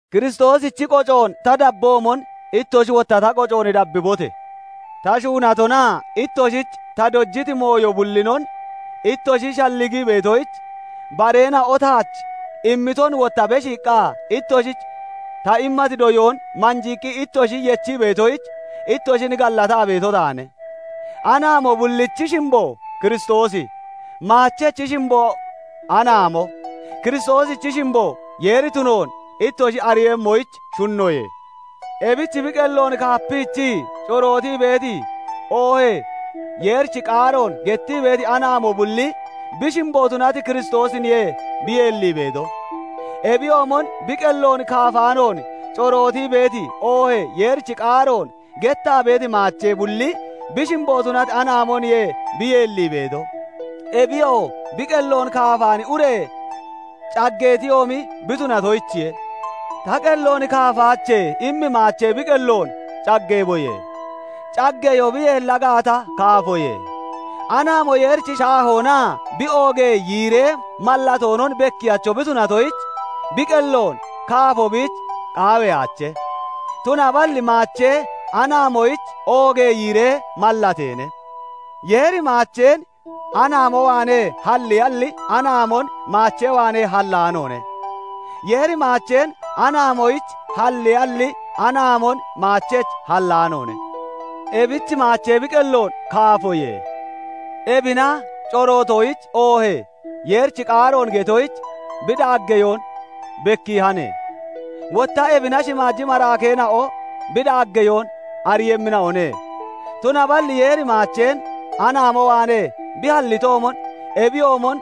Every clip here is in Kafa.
Kiristoosichi qocoon ta dabboomon, ittoshi wotta ta qocoon dabbibote! Ta shuunatonaa ittoshich ta dojiti dooyoo bullinon ittoshi shalligii beetoyich, bareena'o taach immiton, wotta beshiiqqa ittoshich ta immati doyoon manjiiqqi ittoshi yechii beetoyich, ittoshin gallataa beeto taane. Anaamo bullichi shimbo Kiristoosi, maachechi shimbo anaamo, Kiristoosichi shimbo Yeeri tunoon ittoshi ariiyemmoyich shunnoye. Ebich bi qelloon kaapiichii corootii beeti, oohee Yeerichi qaaroon gettii beeti anaamo bulli bi shimbo tunati Kiristoosiniye bi yeellii beeto; ebiyoomon bi qelloon kaafaanoon corootii beeti, oohee Yeerichi qaaroon gettaa beeti maachee bulli bi shimbo tunati anaamoniye bi yeellii beeto; ebiyoo bi qelloon kaafaani ure caggeetiyoomi bi tunatoyichiye. "Ta qelloon kaafaache" immi maachee bi qelloon caggeeboye! Caggeyoo bi yeella gaata, kaafoye. Anaamo Yeerichi shaahoonaa bi oogee yiiree mallatoonon bekkiyacho bi tunatoyich, bi qelloon kaafo biich qaawiyaache; tunaballi maachee anaamoyich oogee yiiree mallateene. Yeeri maacheen anaamo waanee halliyalli, anaamon maachee waanee hallaanoone. Yeeri maacheen anaamoyich halliyalli, anaamon maachech hallaanoone. Ebich maachee bi qelloon kaafoye; ebina corootoyich oohee Yeerichi qaaroon getoyich bi daaggeyoon bekkiihane; wotta ebina shimaaji maraakeena'o bi daaggeyoon ariiyemmina'one. Tunaballi Yeeri maacheen anaamo waanee bi hallitoomon, ebiyoomon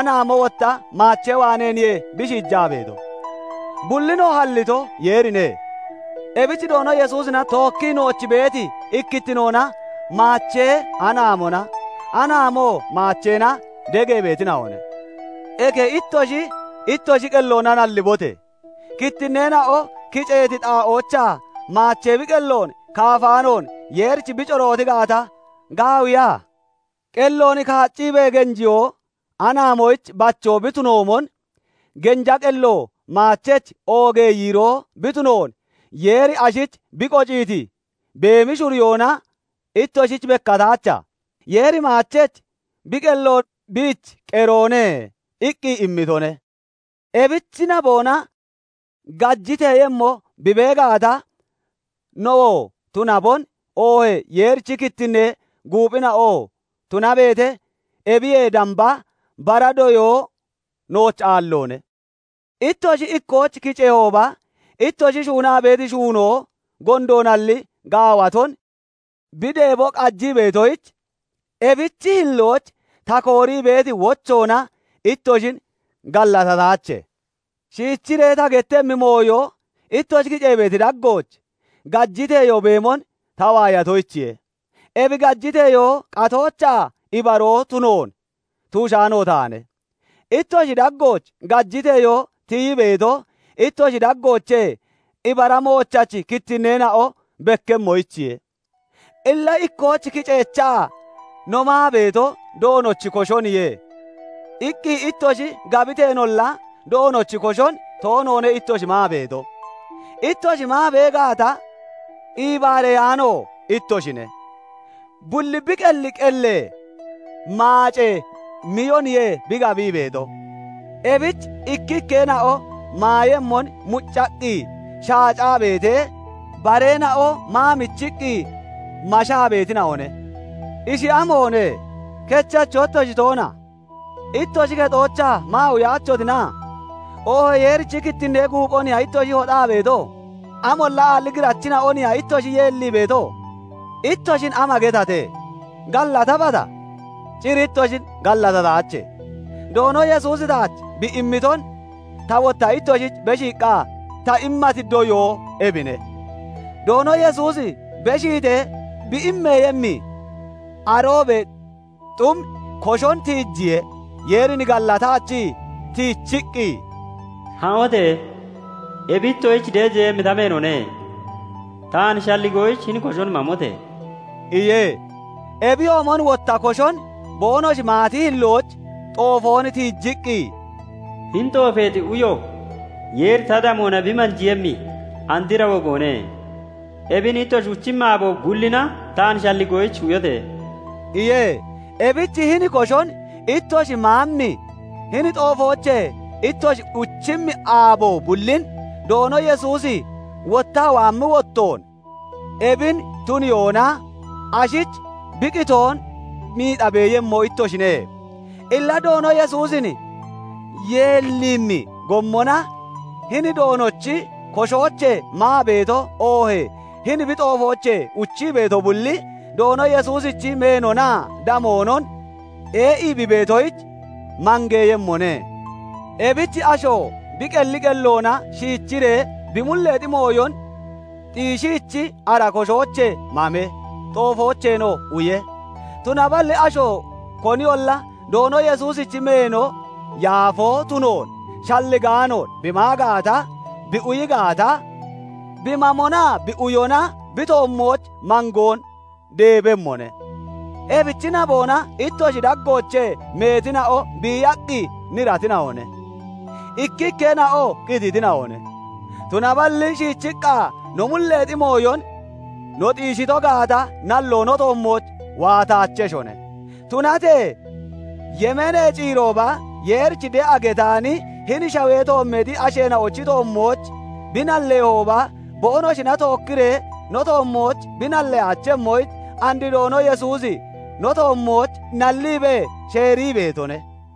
anaamo wotta maachee waaneeniye bi shiijaa beeto; bullinoo hallito, Yeerine. Ebich Doono Yesuusina tookkii nooch beeti ikkittinoona maachee anaamona, anaamoo maacheena degee beetina'one. Eke ittoshi, ittoshi qelloona nallibote! Kittinneena'o kiceeti xaa'oochaa maachee bi qelloon kaafaanoon Yeerich bi corooti gaata, gaawiya? Qelloon kaacciibee genjiyoo anaamoyich bachoo bi tunoomon, genja qello maachech oogee yiiroo bi tunoon Yeeri ashich bi qociiti beemi shuriyoona ittoshich bekkataacha? Yeeri maachech "Bi qello biich qeroone" iqqi immitone. Ebichi naboona gajiteeyemmo bi bee gaata, nowoo tunabon, oohee Yeerichi kittinnee guuphina'oo tunabeete, ebiyee damba bara doyoo nooch aalloone. Ittoshi ikkooch kiceehooba, ittoshi shuunaa beeti shuunoo gondoonalli gaawaton bi deebo qajii beetoyich, ebichi hillooch ta koorii beeti wochoona ittoshin gallatataache. Shiichiree ta gettemmi mooyo, ittoshi kicee beeti daggooch gajiteyoo beemon ta waayatoyichiye; ebi gajiteyoo qatoochaa ibaroo tunoon tuushaano taane. Ittoshi daggooch gajiteyoo tiyii beeto, ittoshi daggoochee ibara moochachi kittinneena'o bekkemmoyichiye. Illa ikkooch kiceechaa, "No maa beeto, Doonochi koshoniye" iqqi ittoshi gabiteenolla, Doonochi koshon toonoone ittoshi maa beeto. Ittoshi maa bee gaata iibaareyaano ittoshine; bulli bi qelli qellee maacee miyoniye bi gabii beeto; ebich ikkikkeena'o maayemmon muccaqqi shaacaa beetee, bareena'o maa michiqqi mashaa beetina'one. Ishi amoone? Kechacho ittoshi toona? Ittoshi kexoochaa maa uyaachotina? Oohee Yeerichi kittinnee guuphoniya ittoshi hoxaa beeto? Amolla aalli girachina'oniya ittoshi yeellii beeto? Ittoshin ama getate? Gallatabata? Cir ittoshin gallatataache. Doono Yesuusi taach bi immiton, ta wotta ittoshich beshiiqqa ta immati doyoo ebine; Doono Yesuusi beshiitee bi immeeyemmi aroobee xum koshon tiijiye; Yeerin gallataachii, tiichiqqi, "Ha'ote! Ebi ittoshich deejeeyemmi ta meenoone. Taan shalligoyich, hini koshon mamote!" iye. Ebiyoomon wotta koshon boonoshi maati hillooch xoofoon tiijiqqi, "Hini xoofeexi uyo Yeeri ta damoona bi manjiiyemmi andra wogoone; ebin ittoshi uchimmi aabo bullina taan shalligoyich, uyote!" iye. Ebich hini koshoon ittoshi maammi, hini xoofoochee ittoshi uchimmi aabo bullin, Doono Yesuusi wottaa waammi wottoon ebin tuniyoona, ashich bi qitoon miixa beeyemmo ittoshine. Illa Doono Yesuusin yeelliimmi gommona, hini Doonochi koshoochee maa beeto, oohee hini bi xoofoochee uchii beeto bulli, Doono Yesuusichi meenonaa damoonon ee'ii bi itoyich, mangeeyemmone. Ebich asho bi qelli qelloona shiichiree bi mulleexi mooyon xiishiichi, ara koshoochee mame; xoofoocheenoo uye. Tunaballi asho koniyolla Doono Yesuusichi meeno yaafoo tunoon shalligaanoon bi maa gaata, bi uyi gaata, bi mamonaa bi uyona bi toommooch mangoon deebemmone. Ebichi naboona ittoshi daggoochee meetina'o biiyaqqi niratina'one; ikkikkeena'oo qititina'one. Tunaballi shiichiqqa no mulleexi mooyon no xiishito gaata, nalloo no toommooch waataacheshone. Tunatee yemeenee ciirooba, Yeerich de'a getaani hini shawee toommeexi asheena'ochi toommooch bi nallehooba, boonoshina tookkiree no tommooch bi nallaachemmoyich, and Doono Yesuusi no toommooch nalliibee sheerii beetone.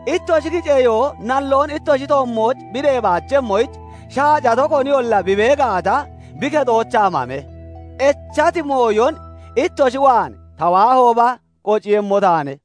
Ittoshi kiceyoo nalloon ittoshi toommooch bi deebaachemmoyich, shaacato koniyolla bi bee gaata, bi kexoochaa mame. Echati mooyon ittoshi waan ta waahooba qociiyemmo taane.